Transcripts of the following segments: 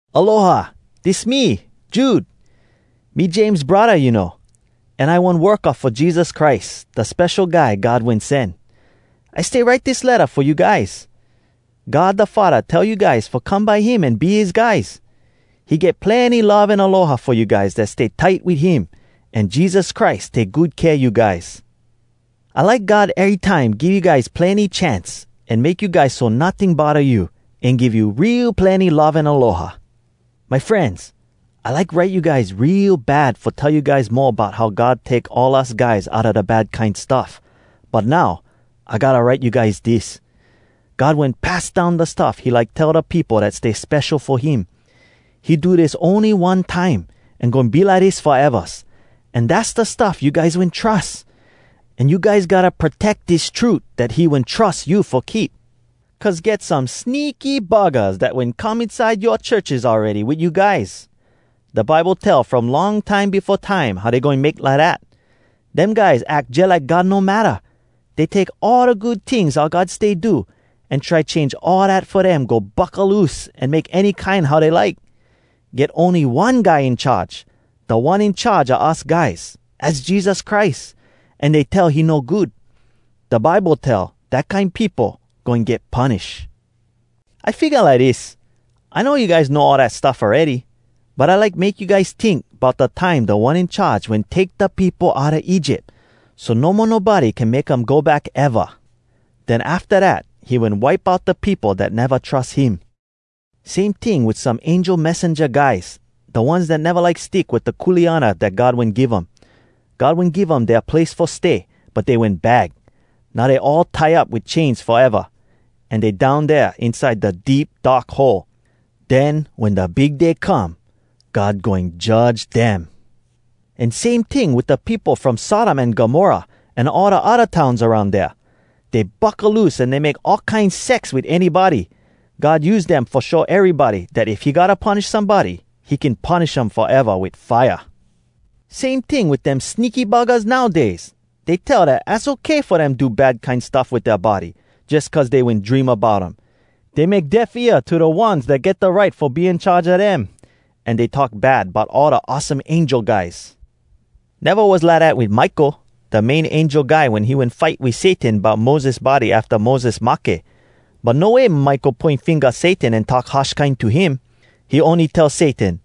Aloha! Dis me, Jude. Me James braddah, you know. An I one worka fo Jesus Christ, da Spesho Guy God Wen Sen. I stay write dis letta fo you guys. God da Faddah tell you guys fo come by him an be his guys. He get plenny love an aloha fo you guys dat stay tight wit him, an Jesus Christ take good kea you guys. I like God erytime give you guys plenny chance, an make you guys so notting bodda you, an give you real plenny love an aloha. My frenz, I like write you guys real bad fo tell you guys mo bout how God take all us guys outa da bad kine stuff. But now, I gotta write you guys dis: God wen pass down da stuff he like tell da peopo dat stay spesho fo him. He do dis ony one time, an goin be lidis foevas. An dass da stuff you guys wen trus. An you guys gotta proteck dis trut dat he wen trus you fo keep. Cuz get some sneaky buggahs dat wen come inside yoa churches awready wit you guys. Da Bible tell from long time befo time, how dey goin make lidat. Dem guys ack jalike God no matta. Dey take all da good tings oua God stay do, an try change all dat fo dem go buckaloose an make any kine how dey like. Get ony one Guy In Charge, Da One In Charge a us guys, az Jesus Christ, an dey tell he no good. Da Bible tell, dat kine peopo goin get punish. I figga lidis: I know you guys know all dat stuff awready. But I like make you guys tink bout da time Da One In Charge wen take da peopo outa Egypt, so no mo nobody can make um go back eva. Den afta dat, he wen wipe out da peopo dat neva trus him. Same ting wit some angel messenja guys, da ones dat neva like stick wit da kuleana dat God wen give um. God wen give um dea place fo stay, but dey wen bag. Now dey all tie up wit chains foeva. An dey down dea inside da Deep Dark Hole. Den wen da Big Day come, God goin judge dem. An same ting wit da peopo from Sodom an Gomorrah an all da odda towns aroun dea. Dey buckaloose an dey make all kine sex wit anybody. God use dem fo show erybody dat if he gotta punish somebody, he can punish um foeva wit fire. Same ting wit dem sneaky buggahs nowdays! Dey tell dat az okay fo dem do bad kine stuff wit dea body, jus cuz dey wen dream about um. Dey make deaf ear to da ones dat get da right fo be in charge a dem. An dey talk bad bout all da awesome angel guys. Neva was lidat wit Michael, da main angel guy wen he wen fight wit Satan bout Moses body afta Moses mahke. But no way Michael poin finga Satan an talk harsh kine to him. He ony tell Satan,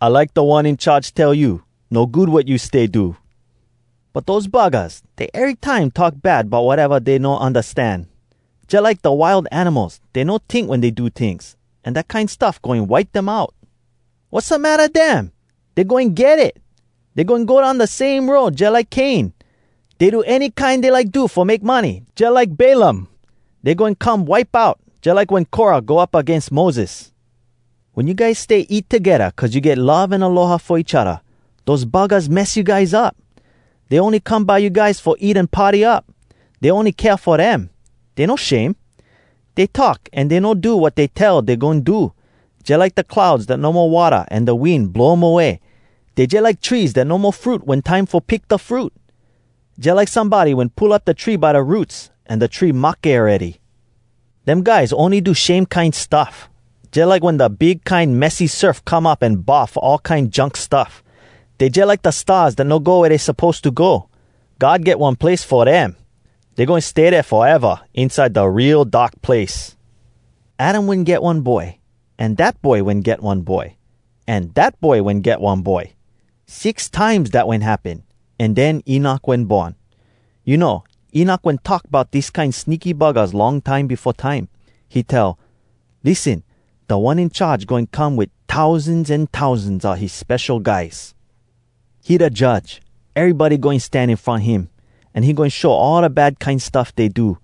“I like Da One In Charge tell you, ‘No good wat you stay do!’” But dose buggahs, dey erytime talk bad bout wateva dey no undastan. Jalike da wild animals, dey no tink wen dey do tings. An dat kine stuff goin wipe dem out. Wassamatta dem?! Dey goin get it! Dey goin go down da same road jalike Cain. Dey do any kine dey like do fo make money, jalike Balaam. Dey goin come wipe out, jalike wen Korah go up agains Moses. Wen you guys stay eat togedda cuz you get love an aloha fo each odda, dose buggahs mess you guys up. Dey ony come by you guys fo eat an party up. Dey ony kea fo dem. Dey no shame. Dey talk an dey no do wat dey tell dey goin do, jalike da clouds dat no mo watta an da wind blow um away. Dey jalike trees dat no mo fruit wen time fo pick da fruit. Jalike somebody wen pull up da tree by da roots, an da tree mahke awready. Dem guys ony do shame kine stuff, jalike wen da big kine messy surf come up an bahf all kine junk stuff. Dey jalike da stars dat no go wea dey suppose to go. God get one place fo dem. Dey goin stay dea foeva, inside da real dark place. Adam wen get one boy, an dat boy wen get one boy, an dat boy wen get one boy. Six times dat wen happen, an den Enok wen born. You know, Enok wen talk bout dis kine sneaky buggahs long time befo time. He tell, “Lissen, Da One In Charge goin come Wit tousans an tousans a his spesho guys. He da Judge. Erybody goin stan in front him, An he goin show all da bad kine stuff dey do.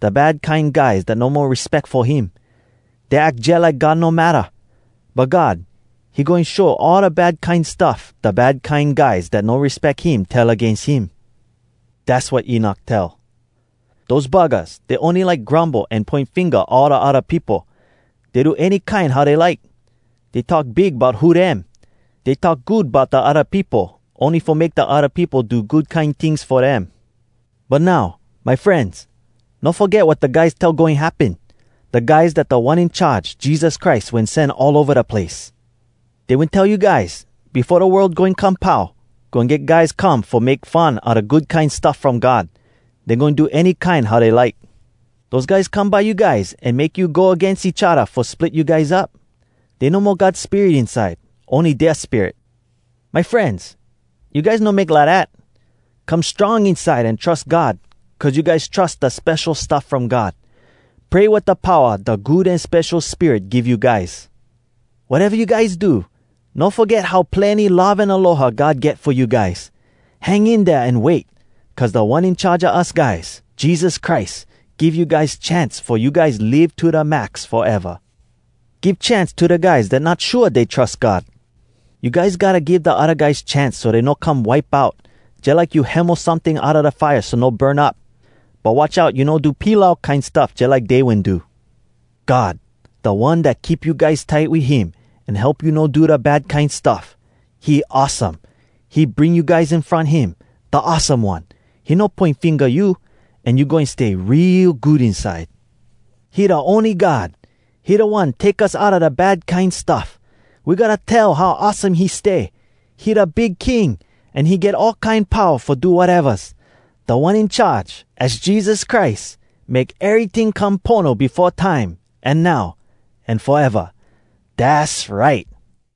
Da bad kine guys dat no mo respeck fo him, Dey ack jalike God no matta. But God, he goin show all da bad kine stuff Da bad kine guys dat no respeck him tell agains him.” Dass wat Enok tell. Dose buggahs, dey ony like grumble an poin finga all da odda peopo. Dey do any kine how dey like. Dey talk big bout who dem. Dey talk good bout da odda peopo, ony fo make da odda peopo do good kine tings fo dem. But now, my frenz, no foget wat da guys tell goin happen, da guys dat Da One In Charge, Jesus Christ, wen sen all ova da place. Dey wen tell you guys, “Befo da world goin come pau, goin get guys come fo make fun a da Good Kine Stuff From God. Dey goin do any kine how dey like.” Dose guys come by you guys an make you go agains each odda fo split you guys up. Dey no mo God Spirit inside, ony dea spirit. My frenz, you guys no make lidat. Come strong inside, an trus God, cuz you guys trus da spesho stuff from God. Pray wit da powa da Good An Spesho Spirit give you guys. Wateva you guys do, no foget how plenny love an aloha God get fo you guys. Hang in dea an wait, cuz Da One In Charge a us guys, Jesus Christ, give you guys chance fo you guys live to da max foeva. Give chance to da guys dat not shua dey trus God. You guys gotta give da odda guys chance so dey no come wipe out, jalike you hemo someting outa da fire so no burn up. But watch out you no do pilau kine stuff jalike dey wen do. God, da One dat keep you guys tight wit him an help you no do da bad kine stuff. He awesome, He bring you guys in front him, Da awesome One, He no poin finga you, An you goin stay real good inside. He da ony God! He da One take us outa da bad kine stuff. We gotta tell how awesome he stay. He da Big King, An he get all kine powa fo do watevas. Da One In Charge, az Jesus Christ, Make eryting come pono Befo time, An now, An foeva. Dass right!